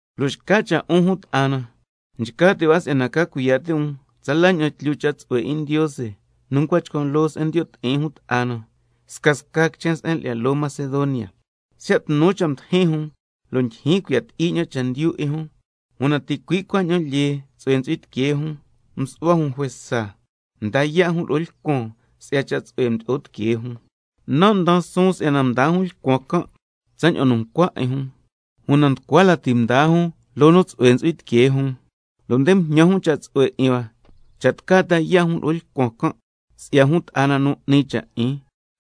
Lo' xca cha' 'un jun ta'a na, nchca ti' hua si'yana ca cuiya' ti' um tsala ña'an tlyu cha' tsu'hue 'in Ndiose nu ncua chcan' loo se'en ndiyo' ti'in jun ta'a na, scasca quichen se'en lyi'ya loo Macedonia. Siya' tnu cha' mdijin jun, lo' ndyijyin cuiya' ti'i ña'an chendyu 'in jun, una ticui' cuaña'an lyee tsu'hue ntsu'hui tiquee jun, msu'hua jun juesa mda yaa' jun lo'o lcuan si'ya cha' tsu'hue nu mdo'o tiquee jun. Nan' ndaan suun si'yana mdaa jun lcuan can' tsaña'an nu ncua 'in jun, una nducua lati mdaa jun loo nu tsu'hue ntsu'hui tiquee jun, lo' nde mjñan jun cha' tsu'hue 'in hua cha' tca lo'o jun ta yaa' jun lo'o lcuan can', si'ya jun ta'a na nu 'ni cha' 'in.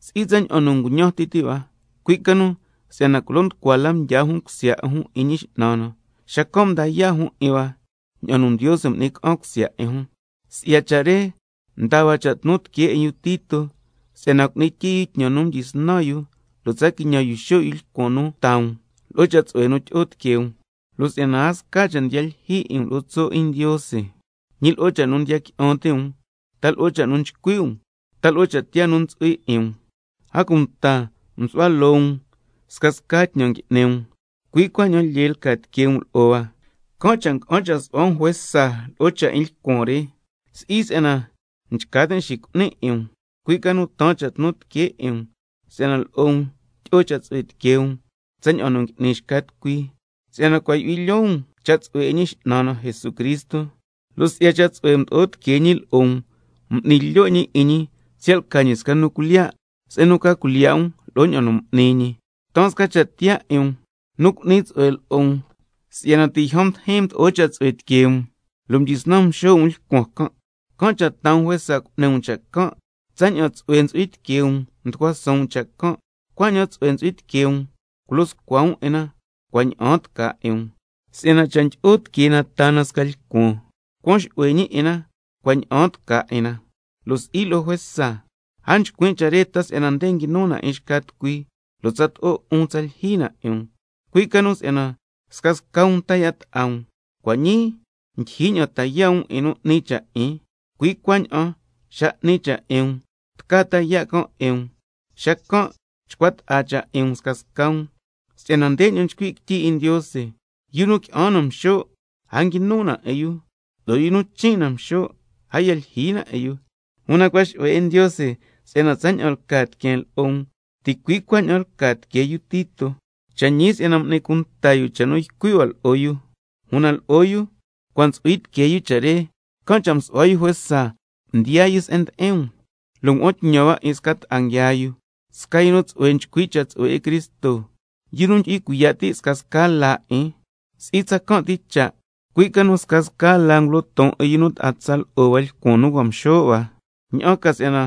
Si'i tsaña'an nu nguñan ti ti' hua, cui' ca nu si'yana culo nducua la mdyaa jun cusya 'in jun 'in Ñi X'nan na, xacan' mda yaa' jun 'in hua ña'an nu Ndiose m'ni ca'an cusya 'in jun. Si'ya cha' re mdaa hua cha' tnu tiquee 'in yu Tito si'yana cu'ni tyii yu tñan nu mdyisnan yu, lo' tsa quiñan xo' yu lcuan nu taa um lo'o cha' tsu'hue nu tyi'o tiquee um. Lo' si'yana a sca cha' ndiya lyijyi 'in um lo'o tso' 'in Ndiose, ñi lo'o cha' nu ndiya qui'an ti' um, ta lo'o cha' nu nchcui' um uta cha' tiyaa nu ntsu'hui 'in um, a cunta nsu'hua loo um scasca tñan ngui'ni um, cui' cuaña'an lyee lca tiquee um lo'o hua, can' cha' nga'an cha' su'hua um juesa lo'o cha' 'in lcuan re. Si'i si'yana nchca tin' xicu'nin 'in um, cui' ca nu taan cha' tnu tiquee 'in um si'yana lo'o um tyi'o cha' tsu'hue tiquee um tsaña'an ngui'ni xca tucui. Si'yana cua' yu'hui lyoo um cha' tsu'hue 'in Ñi X'nan na Jesucristo, lo' si'ya cha' tsu'hue mdo'o tiquee ñi lo'o um, m'ni lyo' ñi 'in ñi siya' lca ñi sca nu cuilyiya', se'en nu ca cuilyiya' um lo'o ña'an nu m'ni ñi. Taan sca cha' tiyaa 'in um nu cu'ni tsu'hue lo'o um, si'yana ti' yjan mdijin mdo'o cha' tsu'hue tiquee um lo' mdyisnan mxo' um lcuan can', can' cha' taa um juesa cu'ni um cha' can'. Tsaña'an tsu'hue ntsu'hui tiquee um mducua suun um cha' can', cuaña'an tsu'hue ntsu'hui tiquee um culo scua um 'in na cua' ña'aan tca 'in um. Si'yana cha' ndyi'o tiquee na taa na sca lcuan, cuan xu'hue ñi 'in na cua' ña'aan tca 'in na, lo' si'i lo'o juesa. A nchcuin' cha' re ta si'yana nde quinu na 'in xca tucui, lo' tsato'o 'un tsa lyijyi na 'in um, cui' ca nu si'yana scasca um ta yaa' ta'a um. Cua' ñii ndyijyi ña'an ta yaa' um 'in nu 'ni cha' 'in, cui' cuaña'an xa nu 'ni cha' 'in um tca ta yaa' can' 'in um, xacan' chcua ta'a cha' 'in um scasca um, si'yana ndeña'an nchcui' quityi 'in Ndiose: —Yu nu qui'an na mxo', a nguinu na 'in yu, lo' yu nu chin' na mxo', a ya lyijyi na 'in yu—. Una cua' xu'hue 'in Ndiose si'yana tsaña'an lca tiqueen lo'o um, ticui' cuaña'an lca tiquee yu Tito. Cha' ñi si'yana m'ni cunta yu cha' nu ycui' hua lo'o yu, una lo'o yu cua' ntsu'hui tiquee yu cha' re, can' cha' msu'hua yu juesa mdiyaa yu se'en ndi'in um, lo' ngua'an tñan hua 'in sca ta'a nguiaa yu, sca yu nu tsu'hue nchcui' cha' tsu'hue 'in Cristo, yu nu ndyu'hui cuiya' ti' scasca laa 'in. Si'i tsacan' ti cha', cui' ca nu scasca laa ngulo ton 'in yu nu ta'a tsa lo'o hua lcuan nu cua' nguia nxo' hua, ña'an ca si'yana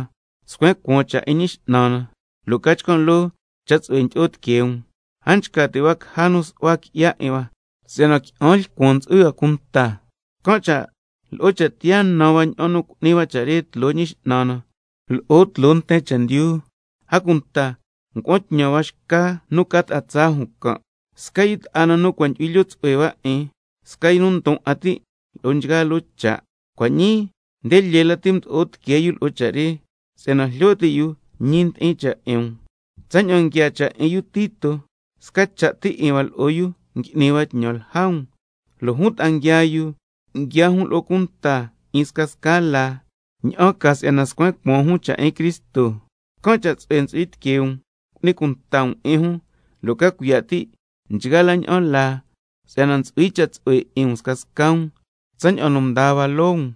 scuen cuaan la cha' 'in Ñi X'nan na, lo' ca chcan' loo cha' tsu'hue ndyi'o tiquee um. A nchca ti' hua caja nu su'hua qui'ya 'in hua si'yana qui'an lcuan ntsu'hui hua cunta, can' cha' —lo'o cha' tiyaa nan hua ña'an nu cu'ni hua cha' re tloo Ñi X'nan na lo'o tloo nten chendyu—. A cunta ngua'an tñan hua xca nu ca ta'a tsaa jun can', sca yu ta'a na nu cua' yu'hui lyoo tsu'hue hua 'in, sca yu ndon 'a ti' lo'o nchgaa loo cha', cua' ñii nde lyee lati mdo'o tiquee yu lo'o cha' re, si'yana jlyo ti' yu ñi ndi'in cha' 'in um. Tsaña'an nguiaa cha' 'in yu Tito, sca cha' ti 'in hua lo'o yu ngui'ni hua tñan lja um, lo' jun ta'a nguiaa yu, nguiaa jun lo'o cunta 'in scasca laa, ña'an ca si'yana scuen cuaan jun cha' 'in Cristo. Can' cha' tsu'hue ntsu'hui tiquee um cu'ni cunta um 'in jun, lo' ca cuiya' ti' nchgaa la ña'an laa si'yana ntsu'hui cha' tsu'hue 'in um scasca um, tsaña'an nu ndaa hua loo um.